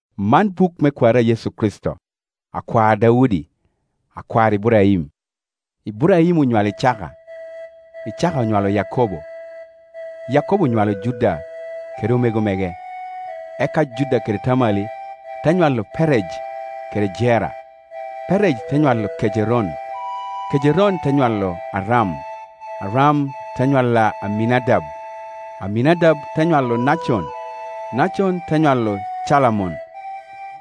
Man buk me kwari a Yecu Kricito, akwar Daudi, akwar Iburaim. Iburaim onywalo Icaka, Icaka onywalo Yakobo, Yakobo onywalo Juda kede omego mege; eka Juda kede Tamali te nywalo Perej kede Jera, Perej te nywalo Kejeron, Kejeron te nywalo Aram; Aram te nywalo Aminadab, Aminadab te nywalo Nacon, Nacon te nywalo Calamon;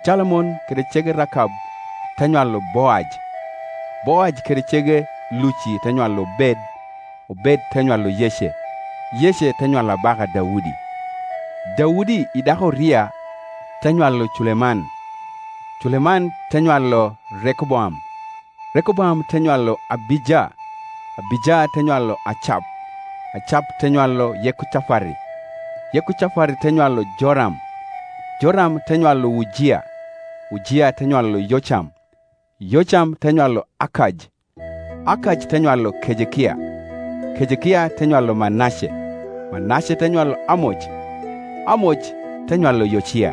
Calamon kede cege Rakab te nywalo Boaj, Boaj kede cege Luci te nywalo Obed, Obed te nywalo Yece; Yece te nywalo abaka Daudi. Daudi i dako a Uria te nywalo Culeman; Culeman te nywalo Rekoboam, Rekoboam te nywalo Abija, Abija te nywalo Acap; Acap te nywalo Yekocafati, Yekocafati te nywalo Joram, Joram te nywalo Ujia; Ujia te nywalo Yocam, Yocam te nywalo Akaj, Akaj te nywalo Kejekia; Kejekia te nywalo Manace, Manace te nywalo Amoc, Amoc te nywalo Yocia;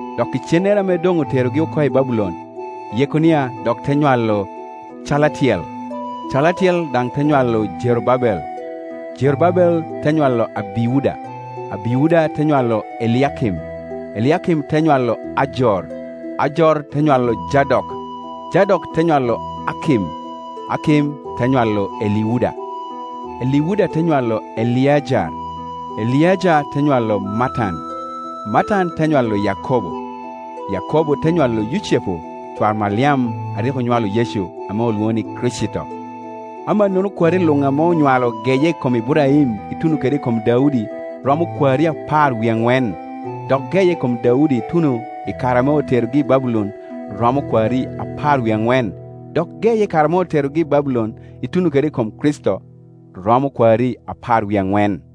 Dok icennere ame doŋ oterogi oko i Babulon, Yekonia dok te nywalo Calatiel, Calatiel daŋ te nywalo Jerubabel; Jerubabel te nywalo Abiuda, Abiuda te nywalo Eliakim, Eliakim te nywalo Ajor; Ajor te nywalo Jadok, Jadok te nywalo Akim, Akim te nywalo Eliuda; Eliuda te nywalo Eleajar, Eleajar te nywalo Matan, Matan te nywalo Yakobo; Yakobo te nywalo Yucepu cwar Maliam a rik onywalo Yecu ame olwoŋo ni Kricito. Amannono kwari luŋ ame onywalo geye i kom Iburaim ituno kede i kom Daudi, romo kwari apar wie aŋwen, dok geye i kom Daudi ituno i kare ame oterogi i Babulon romo kwari apar wie aŋwen, dok geye i kare ame oterogi i Babulon ituno kede i kom Kricito romo kwari apar wie aŋwen.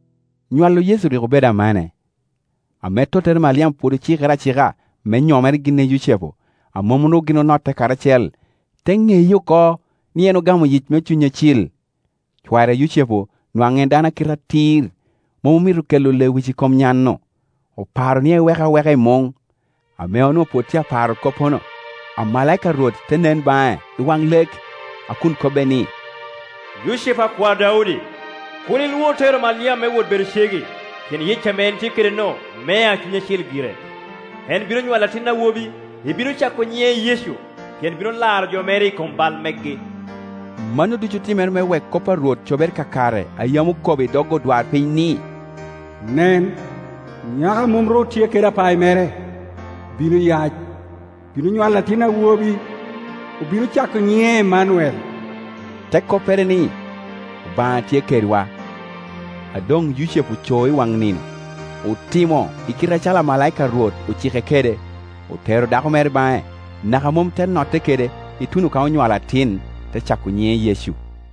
Nywalo Yecu rik obedo amane. Ame tottere Maliam pwod ocikere acika me nyomere gin i Yucepu, a mom ru gin onotte karacel, te ŋeye oko ni en ogamo yic me Cuny Acil. Cware Yucepu nwaŋ en baŋ o a kite atir, mom omito kelo lewic i kom nyan-nu; oparo ni ewek aweka i muŋ. Ame onwoŋo pwod tye aparo koppono, amalaika a Rwot te nen baŋe i waŋ lek, a kun kobbe ni, “Yucepu akwar Daudi, kur ilwor tero Maliam me wot bedo cegi, pien yic ame en tye kede-nu mea Cuny Acil gire. En bino nywalo atin awobi, ibino cako nyiŋe Yecu, pien bino laro jo mere i kom bal megi.” Mano ducu otimere me wek kop a Rwot cobere kakare a yam okobo i dog odwarpiny ni, “Nen, nyako a mom ru tye kede apayi mere, bino yac, bino nywalo atin awobi; obino cako nyiŋe Emmanuel,” te koppere ni, Obaŋa tye kedwa. A doŋ Yucepu oco i waŋ nino, otimo i kite acalo amalaika a Rwot ocike kede; otero dako mere baŋe, naka mom te notte kede, ituno ka onywalo atin; te cako nyiŋe Yecu.